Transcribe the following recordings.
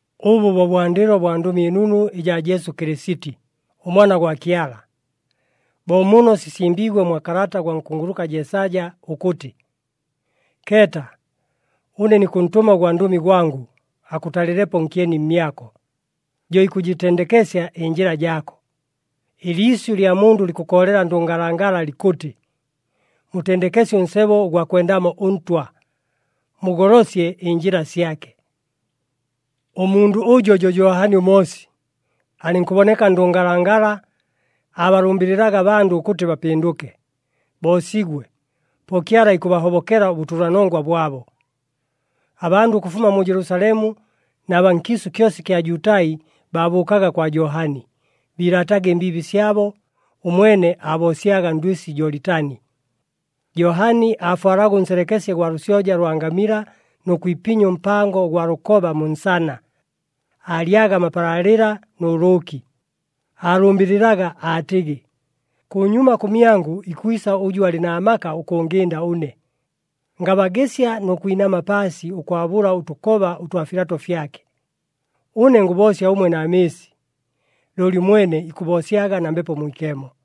Ʉbʉ bo bwandɨlo bwa Ndʉmi ɨNunu ɨjaa Jesu Kɨlɨsiti, ʉMwana gwa Kyala. Bo muno sisimbiigwe mwa kalata gwa nkunguluka Jeesaja ʉkʉtɨ, “Keeta, ʉne nikʉntʉma ʉgwandʉmi gwangʉ, akʉtalɨlepo nkyeni mmyako, jo ikʉjɨtendekesya ɨnjɨla jaako.” “Ɨliisyʉ lya mundʉ likʉkoolela ndʉngalangala likʉtɨ, ‘Mutendekesye ʉnsebo ʉgwa kwendamo ʉNtwa! Mugolosye ɨnjɨla syake!’” Ʉmundʉ ʉjo jo Johani ʉMoosi. Alɨnkʉboneka ndʉngalangala, aabalʉmbɨlɨlaga abandʉ ʉkʉtɨ bapɨndʉke, boosigwe, po Kyala ikʉbahobokela ʉbʉtʉlanongwa bwabo. Abandʉ ʉkʉfuma mu Jelusalemu na baa nkiisʉ kyosa ɨkya Jutai baabʉʉkaga kwa Johani. Biilaataga ɨmbiibi syabo, ʉmwene aaboosyaga ndwɨsi Jolitani. Johani aafwalaga ʉnselekesye gwa lʉsyoja lwa ngamila nʉ kwipinya ʉmpango ʉgwa lʉkoba mu nsana, aalyaga amapalaalɨla nʉ lʉʉki. Aalʉmbɨlɨlaga, aatɨgɨ, “Kʉnyuma kʉmyangʉ ikwisa ʉjʉ alɨ na maka ʉkʉngɨnda ʉne, ngabagɨsya nʉ kwinama paasi ʉkwabʉla ʉtʉkoba ʉtwa filato fyake. Ʉne ngʉboosya ʉmwe na mɨɨsi, looli ʉmwene ikʉboosyaga na Mbepo Mwikemo.”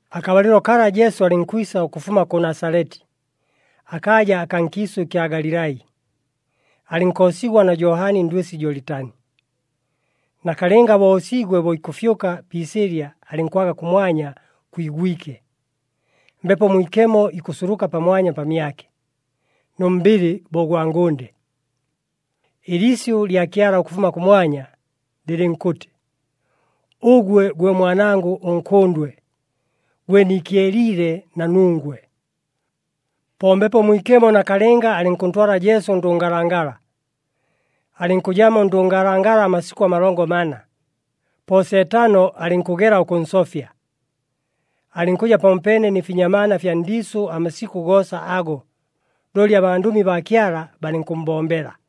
Akabalɨlo kala Jesu alɨnkwisa ʉkʉfuma kʉ Nasaleti, akaaja akaa nkiisʉ ɨkya Galilai, alɨnkoosigwa na Johani ndwɨsi Jolitani. Nakalɨnga bo oosiigwe, bo ikʉfyʉka pi isɨɨlya alɨnkwaga kʉmwanya kwigwike, Mbepo Mwikemo ikʉsuluka pamwanya pamyake, nʉ mbɨlɨ bo ʉgwa ngʉnde. Ɨliisyʉ lya Kyala ʉkʉfuma kʉmwanya, lɨlɨnkʉtɨ, “Ʉgwe gwe Mwanangʉ ʉNkʉndwe, gwe niikyeliile na nungwe.” Po Mbepo Mwikemo nakalɨnga alɨnkʉntwala Jesu ndʉngalangala. Alɨnkʉjamo ndʉngalangala amasikʉ amalongo mana, po Seetano alɨnkʉgela ʉkʉnsofya. Alɨnkʉja pamopeene nɨ finyamaana fya ndiisʉ amasikʉ goosa ago, looli abandʉmi baa Kyala balɨnkʉmmbombela.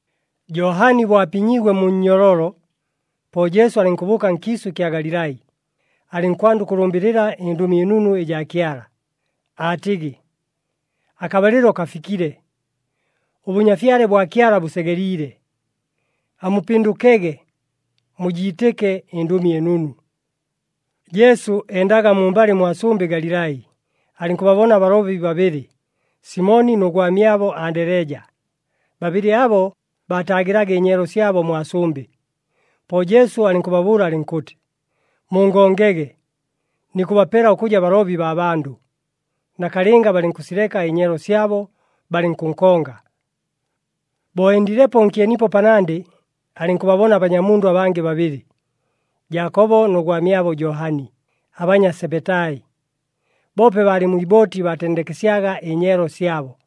Johani bo apinyiigwe mu nnyololo, po Jesu alɨnkʉbʉʉka nkiisʉ ɨkya Galilai, alɨnkwanda ʉkʉlʉmbɨlɨla ɨNdʉmi ɨNunu ɨjaa Kyala, aatɨgɨ, “Akabalɨlo kafikile, ʉBʉnyafyale bwa Kyala bʉsegeliile. Amupɨndʉkege, mujiitɨke ɨNdʉmi ɨNunu!” Jesu endaga mumbalɨ mwa sʉmbɨ Galilai, alɨnkʉbabona abalobi babɨlɨ, Simoni nʉ gwamyabo Andeleja. Babɨlɨ abo baataagɨlaga ɨnyeelo syabo mwa sʉmbɨ. Po Jesu alɨnkʉbabʉʉla alɨnkʉtɨ, “Mungongege! Nikʉbapela ʉkʉja balobi baa bandʉ.” Nakalɨnga balɨnkʉsileka ɨnyeelo syabo, balɨnkʉnkonga. Bo endilepo nkyenipo panandɨ, alɨnkʉbabona abanyamundʉ abangɨ babɨlɨ, Jaakobo nʉ gwamyabo Johani, abanya Sebetai. Boope baalɨ mwi ibooti baatendekesyaga ɨnyeelo syabo.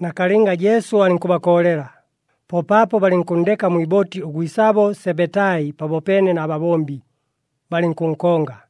Nakalɨnga Jesu alɨnkʉbakoolela, po paapo balɨnkʉnndeka mwi ibooti ʉgwisabo Sebetai pamopeene na babombi, balɨnkʉnkonga.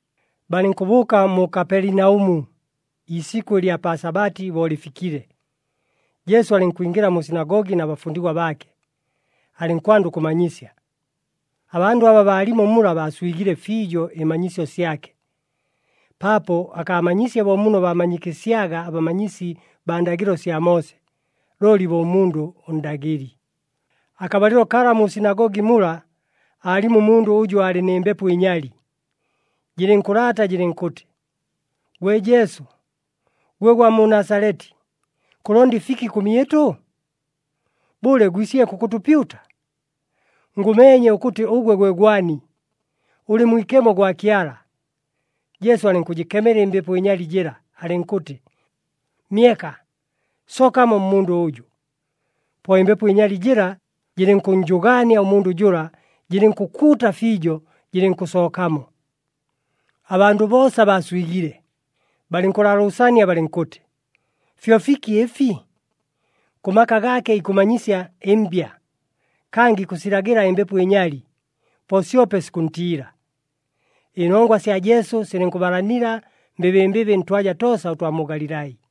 Balɨnkʉbʉʉka mu Kapelinaʉmu. Iisikʉ ɨlya pa Sabati bo lɨfikile, Jesu alɨnkwingɨla mu sinagogi na bafundigwa baake, alɨnkwanda ʉkʉmanyisya. Abandʉ aba baalimo mula baaswigile fiijo ɨmanyisyo syake. Paapo akaamanyiisye bo muno baamanyikɨsyaga abamanyisi baa ndagɨlo sya Moose, looli bo ʉmundʉ ʉndagɨli. Akabalɨlo kala mu sinagogi mula aalimo ʉmundʉ ʉjʉ aalɨ nɨ mbepo ɨnyali, jɨlɨnkʉlaata jɨlɨnkʉtɨ, “Gwe Jesu, gwe gwa mu Nasaleti, kʉlonda ɨfiki kʉmyɨtʉ? Bʉle, gwisile kʉkʉtʉpyuta? Ngʉmeenye ʉkʉtɨ ʉgwe gwe gwani. Ʉlɨ Mwikemo gwa Kyala!” Jesu alɨnkʉjɨkemela ɨmbepo ɨnyali jɨla, alɨnkʉtɨ, “Myeka! Sookamo mmundʉ ʉjʉ!” Po ɨmbepo ɨnyali jɨla jɨlɨnkʉnnjʉgaania ʉmundʉ jʉla, jɨlɨnkʉkuuta fiijo, jɨlɨnkʉsookamo. Abandʉ boosa baaswigile, balɨnkʉlaalʉʉsania balɨnkʉtɨ, “Fyo fiki ɨfi? Kʉ maka gaake ikʉmanyisya ɨmbya. Kangɨ ikʉsilagɨla ɨmbepo ɨnyali, po syope sikʉntiila!” Ɨnongwa sya Jesu silɨnkʉbalanila mbɨbɨmbɨbɨ ntwaja toosa ʉtwa mu Galilai.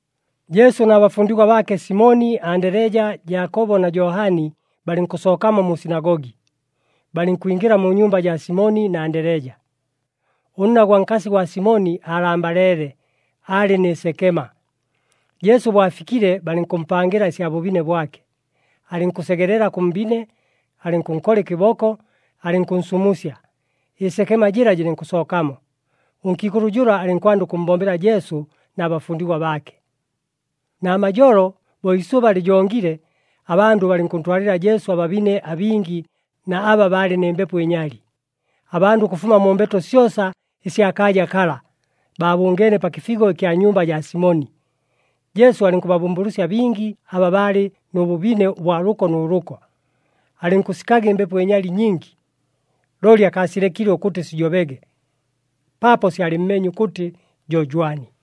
Jesu na bafundigwa baake Simoni, Andeleja, Jaakobo na Johani balɨnkʉsookamo mu sinagogi, balɨnkwingɨla mu nyumba jaa Simoni na Andeleja. Ʉnna gwa nkasi gwa Simoni aalambaleele, aalɨ nɨ sekema. Jesu bo afikile balɨnkʉmpangɨla ɨsya bʉbine bwake. Alɨnkʉsegelela kʉ mbine, alɨnkʉnkola ɨkɨboko, alɨnkʉnsumusya, ɨsekema jɨla jɨlɨnkʉsookamo. Ʉnkiikʉlʉ jʉla alɨnkwanda ʉkʉmmbombela Jesu na bafundigwa baake. Namajolo, bo iisʉba lɨjongile, abandʉ balɨnkʉntwalɨla Jesu ababine abingi na aba baalɨ nɨ mbepo ɨnyali. Abandʉ ʉkʉfuma mu mbeto syosa ɨsya kaaja kala, baabʉngeene pa kɨfigo ɨkya nyumba jaa Simoni. Jesu alɨnkʉbabʉmbʉlʉsya bingi aba baalɨ nʉ bʉbine ʉbwa lʉko nʉ lʉko. Alɨnkʉsikaga ɨmbepo ɨnyali nyingi, looli akaasilekile ʉkʉtɨ sijobege, paapo syalɨmmeenye ʉkʉtɨ jo jwani.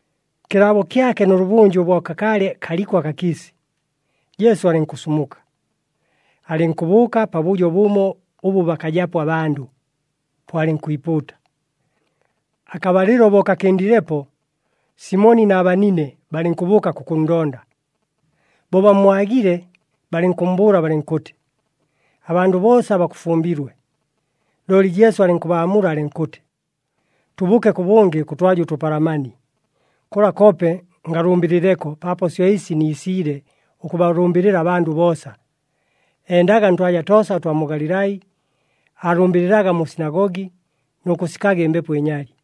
Kɨlaabo kyake nʉlʉbʉnjʉ bo kakaalɨ kaliko akakiisi, Jesu alɨnkʉsumuka, alɨnkʉbʉʉka pabʉjo bʉmo ʉbʉ bakajapo abandʉ, po alɨnkwipuuta. Akabalɨlo bo kakɨndilepo, Simoni na banine balɨnkʉbʉʉka kʉkʉnndonda. Bo bammwagile balɨnkʉmmbʉʉla balɨnkʉtɨ, “Abandʉ boosa bakʉfumbilwe.” Looli Jesu alɨnkʉbaamula alɨnkʉtɨ, “Tʉbʉʉke kʉbʉngɨ kʉtwaja ʉtʉpalamani. Kʉla koope ngalʉmbɨlɨleko, paapo syo ɨsi niisiile, ʉkʉbalʉmbɨlɨla abandʉ boosa.” Endaga ntwaja toosa ʉtwa mu Galilai, aalʉmbɨlɨlaga mu sinagogi nʉ kʉsikaga ɨmbepo ɨnyali.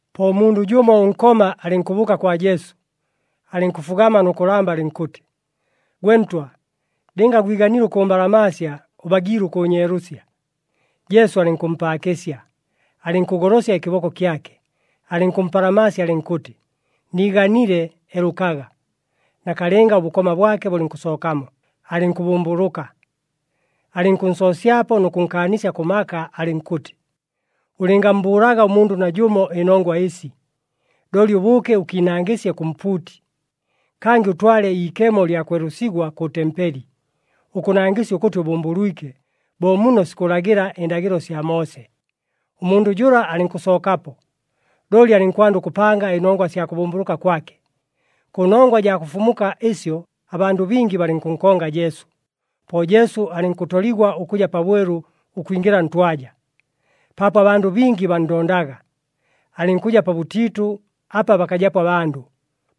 Po ʉmundʉ jʉmo ʉnkoma alɨnkʉbʉʉka kwa Jesu, alɨnkʉfugama nʉ kʉlamba, alɨnkʉtɨ, “Gwe Ntwa, lɨnga gwiganile ʉkʉmbalamaasya, ʉbagiile ʉkʉʉnyeelʉsya.” Jesu alɨnkʉmpaakɨsya, alɨnkʉgolosya ɨkɨboko kyake, alɨnkʉmpalamaasya, alɨnkʉtɨ, “Niiganile, elʉkaga.” Nakalɨnga ʉbʉkoma bwake bʉlɨnkʉsookamo, alɨnkʉbʉmbʉlʉka. Alɨnkʉnsoosyapo nʉ kʉnkaanisya kʉ maka, alɨnkʉtɨ, “Ʉlɨngammbʉʉlaga ʉmundʉ najʉmo ɨnongwa ɨsi! Looli ʉbʉʉke ʉkiinangɨsye kʉ mpuuti. Kangɨ ʉtwale iikemo lya kwelʉsigwa kʉ tempeli, ʉkʉnangɨsya ʉkʉtɨ ʉbʉmbʉlwike, bo muno sikʉlagɨla ɨndagɨlo sya Moose.” Ʉmundʉ jʉla alɨnkʉsookapo, looli alɨnkwanda ʉkʉpanga ɨnongwa sya kʉbʉmbʉlʉka kwake. Kʉnongwa jaa kʉfumuka ɨsyo abandʉ bingi balɨnkʉnkonga Jesu. Po Jesu alɨnkʉtoligwa ʉkʉja pabwelu ʉkwingɨla ntwaja, paapo abandʉ bingi banndondaga, alɨnkʉja pabʉtiitʉ apa bakajapo abandʉ.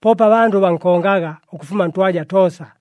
Poope abandʉ bankongaga ʉkʉfuma ntwaja toosa.